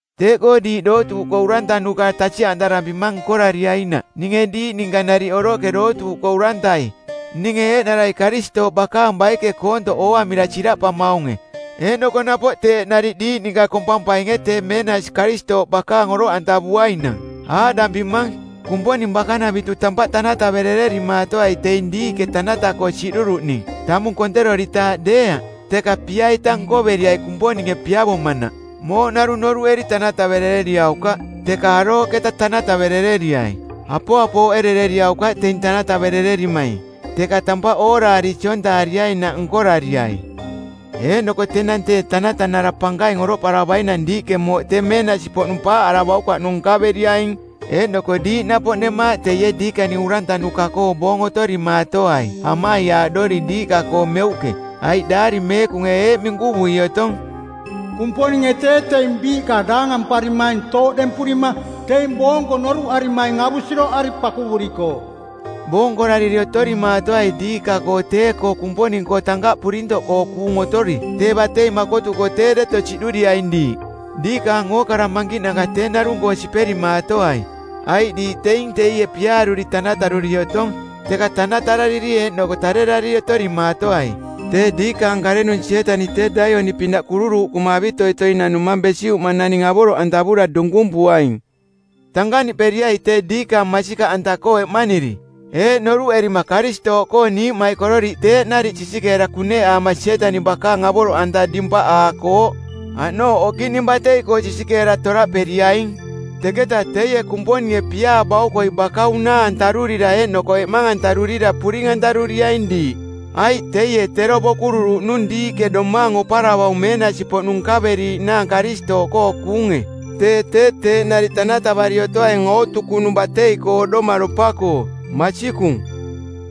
Teeꞌkoo diiꞌ dootuuꞌkoo urantanuka tasiꞌantarampimang nkorariainaꞌ ninge diiꞌ ninka nariꞌ oroꞌke dootuuꞌkoo urantai, ninge eeꞌnara Karistooꞌ bakaang baike koontoꞌ ooamira siraꞌpamaunge, eeꞌnoko napoꞌ teeꞌ nariꞌ diiꞌ ninka kompampainge tee meenasi Karistooꞌ bakaang oroꞌantavuainang. Aaꞌdampimang: Kumponing bakanavitu tampaꞌ tanataverererimaatoai teing diiꞌke tanata-koo siꞌduruꞌning, tamung konteroritaaꞌ deeaꞌ, teka pia-ita nkoveriai Kumponinge piavomanaꞌ. Mooꞌ narung noruꞌeri tanataverereriaukaꞌ, teka arooꞌketa tanataverereriai. Apoapooꞌerereriaukaꞌ teing tanataverererimaing teka tampaꞌ ooraari siontaariainaꞌ nkorariai. Eeꞌnoko tenang tee Tanatanara Pankaing oroꞌparavainang diiꞌke mooꞌ tee meenasi-poꞌnung paaꞌaravaukaꞌnung nkaveriaing. Eeꞌnoko diiꞌ napoꞌ nemaaꞌ teie diikaning urantanuka-koo boong otorimaatoai amaiaaꞌdori diiꞌka-koo meuꞌke, aiꞌ Daari Meekunge eeꞌ minkuvui otong: Kumponinge tee teing biiꞌka daangamparimaing tooꞌdempurima teing boonko noruꞌarimaing avusiroꞌari pakuvurikooꞌ. Boonkorariri otorimaatoai diiꞌka-koo tee-koo Kumponing-koo tankaꞌ purintoꞌkoo kuung otori, tee batei makotuko tee deto siꞌduriaing diiꞌ. Diikaang ookara mankiꞌnanka tee narung-koo siperimaatoai, aiꞌ diiꞌ teing teie piaaruri tanataruri otong. Teka tanatarariri eeꞌnoko tarerariri otorimaatoai. Tee diikaang karenung Sietaniꞌ tee laioni-pinaꞌ kururuuꞌkuma avitoitoi nanumaung besiꞌuma naning avoroꞌantavura dunkumpuaing. Tankaꞌniꞌperiai tee diikaang masikaꞌanta-koo eꞌmaniri, eeꞌ noruꞌerima Karistooꞌkoo niiꞌmaikororiꞌ teeꞌ nariꞌ sisikeera kuneꞌaama Sietaniꞌ bakaang avoroꞌanta dimpaꞌaakooꞌ. Aꞌnooꞌ okiꞌning batei-koo sisikeera toraꞌperiaing. Teketa teie Kumponinge piaa baukoi baka unaa-antarurira eeꞌnoko eꞌmang-antarurira puring-antaruriaing diiꞌ, aiꞌ teie tero bokururuꞌnung diiꞌke domaang oparavaung meenasi-poꞌnung nkaveriiꞌnaang Karistooꞌkoo kuunge. Tee tee teeꞌ nariꞌ tanatavari otoaing ootukunung batei-koo oꞌdomaropa-koo. Masikung.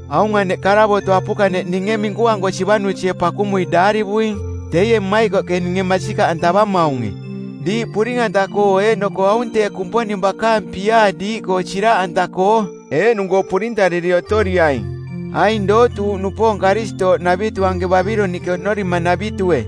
Aung aneꞌ karavoto˜ apukaneꞌ ninge minkuanko Sivanusie pakumui daarivuing, teie mmaikoꞌke ninge masikaꞌantavamaunge, diiꞌ puring-anta-koo eeꞌnoko aung tee Kumponing bakaang piaa diiꞌkoo siraꞌanta-koo. Eeꞌnung-koo purintariri otoriaing. Aing dootuuꞌnupoong Karistooꞌnavitu anke Babiloniꞌke oꞌnorimanavitue,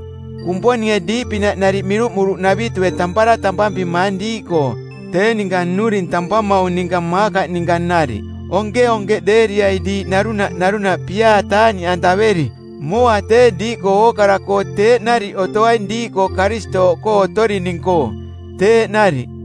Kumponinge diiꞌpinaꞌ nariꞌ miruꞌmuruꞌnavitue tampara tampampimaang diiꞌkoo, tee ninka nnuring tampamaung ninka Maakaꞌ ninka nariꞌ. Onkeonkeꞌdeeriai diiꞌ narunaꞌ narunaꞌ piaa taaꞌniꞌantaveri. Mooa tee diiꞌkoo ookara-koo teeꞌ nariꞌ otoaing diiꞌkoo Karistooꞌkoo otorining-koo. Teeꞌ nariꞌ.